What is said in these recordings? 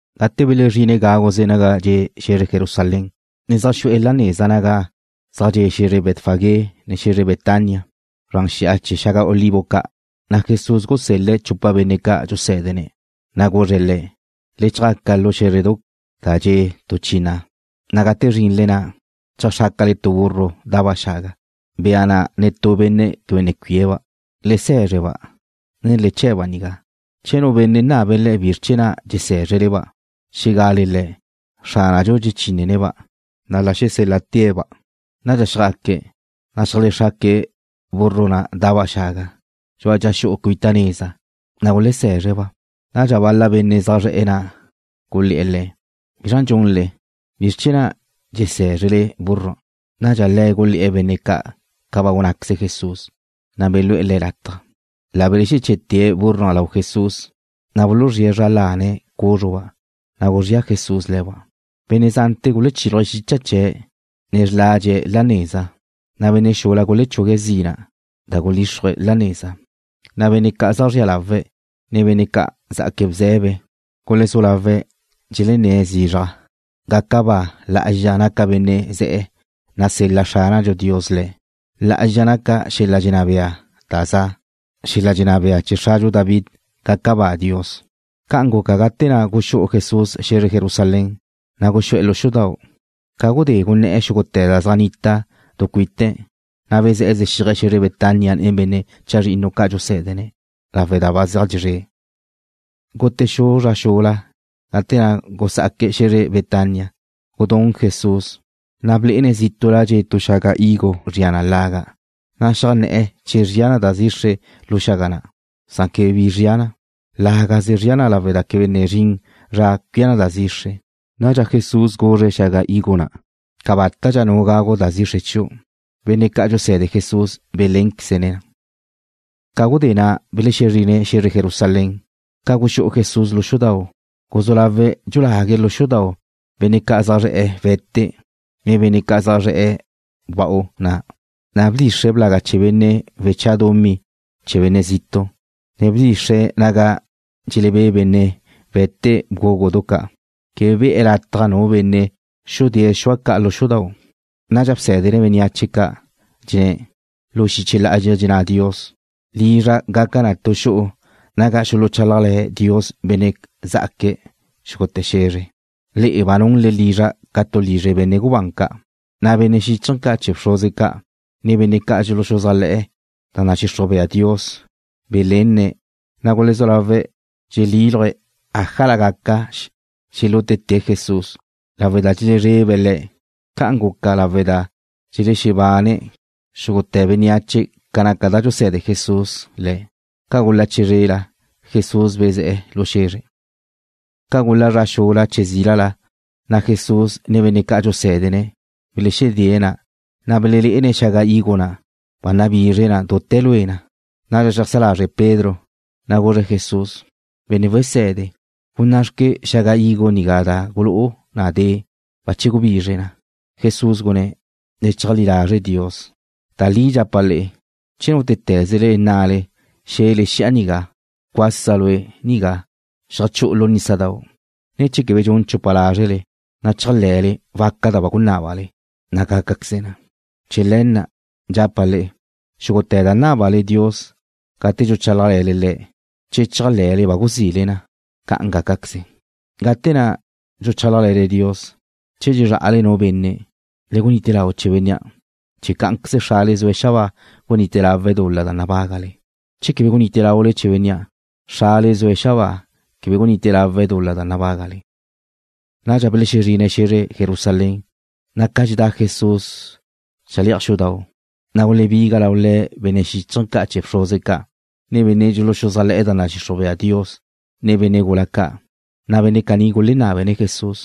Gate belezrine̱' gáguze naga dxe' xe̱zre Jerusalén, ne zaj xu'e̱ la neza naga zaj dxe' xe̱zre Betfagé, ne xe̱zre Betania zran xi'a chee̱ xaga olivo ca', na' Jesús gusel-le̱' chupa benne' ca' dxusé̱dene̱', na' guzre̱' le̱': ―Le chjaca lu xé̱zredau' da dxe' tu chi na', na' gate zrinle na', cheajxrácale tu burro da'ba' xaga, bea na' netú benne' quebe ne cuie̱' le̱ba'. Le se̱zre-ba', ne le che̱'-ba' nigá. Che nu benne' nabe̱' le'e bizr chee̱ na' dxesé̱zrele-ba', xé̱gale le̱': “Xránadxu dxechine̱'-ba'”, na' la xesél-la'te̱' le̱ba'. Nadxa xjaque̱', ne xeajlexraque̱' burro na' da'ba' xaga dxu'a dxa xu'u cuita neza, na' gulesé̱zre̱'-ba'. Nadxa bal-la benne' zaj zre̱'e̱ na' gulé̱'e̱ le̱': ―¿Bizra' dxunle? ¿Bizr chee̱ na' dxesé̱zrele búrrua'? Nadxa le̱' gulé̱'e̱ benne' ca' ca ba gunnáqueze Jesús, na' belúe̱' le̱' lataj. La belexeché̱'e̱te̱' búrrua' lau Jesús, na' buluzríe̱' zra lane̱' cúzruba', na' guzría Jesús le̱ba'. Benne' zante̱ gulechíluje̱' xicha chee̱', ne xladxe̱' la neza, na' benne' xula gulechugue̱' zina' da gulíxrue̱' la neza. Na' benne' ca' zaj zrie̱' lawe', ne benne' ca' zjaque̱' bze̱be, gulezú lawe̱' dxelenné̱' zizraj: ―¡Gaca ba! ¡Lá'azxa naca benne' ze̱'e̱, nasel-la Xránadxu Dios Le̱'! ¡Lá'azxa naca xel-la dxenná bea da za', xel-la dxenná bea chee̱ xradxu David! ¡Gaca ba Dios! Ca'an guca gate na' guxú'u Jesús xe̱zre Jerusalén, na' guxú'e̱ lu xudau'. Ca gudé gunné̱'e̱ xúgute̱ da zaj nnita du cuite̱', na' bezé̱'e̱ zexíaje̱' xe̱zre Betania nen benne' chazrinnu ca' dxusé̱dene̱', lawe' da ba zeaj dxezré'. Gute xu zra xula gate na' gusá'aque̱' xe̱zre Betania, gudún Jesús. Na' blé'ene̱' zítu'la dxe' tu xaga higo zria na laga', na' xeajnné̱'e̱ che zria da zixre lu xaga na', san quebe bi zria na. Lágaze zria na lawe' da quebe ne zrin zra cuía na da zixre. Nadxa Jesús guzre̱' xaga higo na': ―Cabátadxa nu gagu da zixre chiu'. Benne' ca' dxuse̱de Jesús belénqueze̱' na. Ca gudé na' belexezrine̱' xe̱zre Jerusalén. Ca guxú'u Jesús lu xudau', guzú lawe̱' dxulague̱' lu xudau' benne' zaj zre̱'e̱ we̱te, ne benne' zaj zre̱'e̱ wewa'u na'. Na' bdxixre̱' blaga chee̱ benne' weche̱'e̱ dumí chee̱ benne' zitu', ne bdxixre̱' naga dxelebé' benne' we̱te bgúgudu ca'. Quebe be̱'e̱ lataj nu benne' xudée̱' xua ca' lu xudau'. Nadxa bsé̱dene̱' bénneache ca', dxenné̱': ―Lu xiche lá'azxa dxenná Dios: “Lizra' gaca na tu xu'u naga xuluchálajle̱ Dios benne' zá'aque̱' xúgute̱ xe̱zre.” Le'e ba nunle lizra' ca tu lizre benne' gubán ca'. Na' benne' xíchaje̱ ca' chee̱ bxruze ca', ne benne' dxuluxuzájle̱'e̱ ca da nadxixruj bea Dios belenne̱', na' gulezú lawe̱' dxelexíluje̱' ájala gaca xelútete̱' Jesús lawe' da dxelezrebe̱' Le̱'. Ca'an guca lawe' da dxelexebane xúgute̱ bénneache ca naca da dxuse̱de Jesús le̱'. Ca gula chizrela, Jesús bezé̱'e̱ lu xe̱zre. Ca gula zra xula che zílala, na' Jesús, ne benne' ca' dxusé̱dene̱' belexedée̱' na', na' belelé'ene̱' xaga higo na', ba nabizre na dute̱ lue na. Nadxa xeajsá lazre Pedro, na' guzre̱' Jesús: ―Benne' wese̱de, gunná'xque xaga higo nigá da gulú'u na de'. Bache gubizre na. Jesús gunné̱': ―Le cheajlí lazre Dios. Da li dxapa' le'e, che nútete̱zele nnale, xe̱le xi'a nigá: “Cuasa lue' nigá, xeajchú'u lu nísadau'”, ne che quebe dxun chupa lázrele, na' chéajle̱le waca da ba gunnale, na' gácaqueze na. Chee̱ le̱ na' dxapa' le'e, xúgute̱ da nábale Dios gate dxuchálajle̱le Le̱', che chéajle̱le ba guzile na, ca'an gácaqueze. Gate na' dxuchálajle̱le Dios, che dxezrá'ale nu benne', le gunite lau chee̱ bénnea' chee̱ cá'anqueze Xrale zue̱' xabáa gunite lawe̱' dul-la da nabágale. Che quebe gunite laule chee̱ bénnea', Xrale zue̱' xabáa quebe gunite lawe̱' dul-la da nabágale. Nadxa belexezrine̱' xe̱zre Jerusalén, na' ca dxedá Jesús le̱'aj xudau', na' gulebiga lau Le̱' benne' xíchaje̱ ca' chee̱ bxruze ca', ne benne' dxuluxuzájle̱'e̱ da nadxixruj bea Dios, ne benne' gula ca'. Na' benne' caní gulenábene̱' Jesús: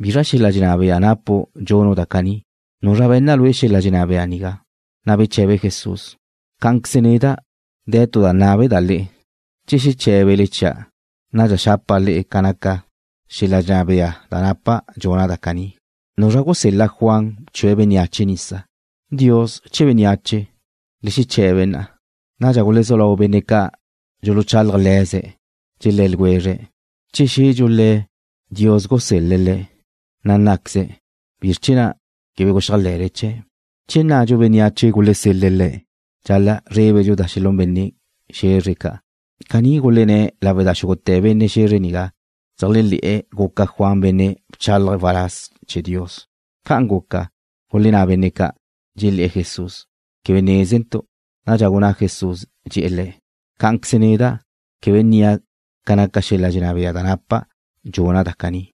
―¿Bizra xel-la dxenná bea napu' dxunu' da caní? ¿Nuzra be̱nna lue' xel-la dxenná bea nigá? Na' beche̱be Jesús: ―Cá'anqueze neda' de̱ tu da nábeda' le'e. Che xeché̱bele chia', nadxa xapa' le'e ca naca xel-la dxenná bea da napa' dxuna' da caní. ¿Nuzra gusel-la Juan bchue̱' bénneache nisa? ¿Dios che bénneache? Le xeche̱be na'a. Nadxa gulezú lau benne' ca' dxuluchálaje̱' le̱ze̱', dxelé̱ ljwezre̱': ―Che xe̱dxu Le̱', Dios gusel-le̱' le̱', na' nnáqueze̱': “¿Bizr chee̱ na' quebe guxéajle̱le chee̱'?” Che nnadxu bénneache gulesel-le̱' le̱', dxal-la' zrébedxu da xelún benne' xe̱zre ca'. Caní gulenné̱' lawe' da xúgute̱ benne' xe̱zre nigá dxeléajle̱'e̱ guca Juan benne' bchálaje̱' waláz chee̱ Dios. Ca'an guca, gulenná benne' ca', dxelé̱'e̱ Jesús: ―Quebe nézentu'. Nadxa gunná Jesús, dxe̱'e̱ le̱': ―Cá'anqueze neda' quebe nnia' ca naca xel-la dxenná bea da napa' dxuna' da caní.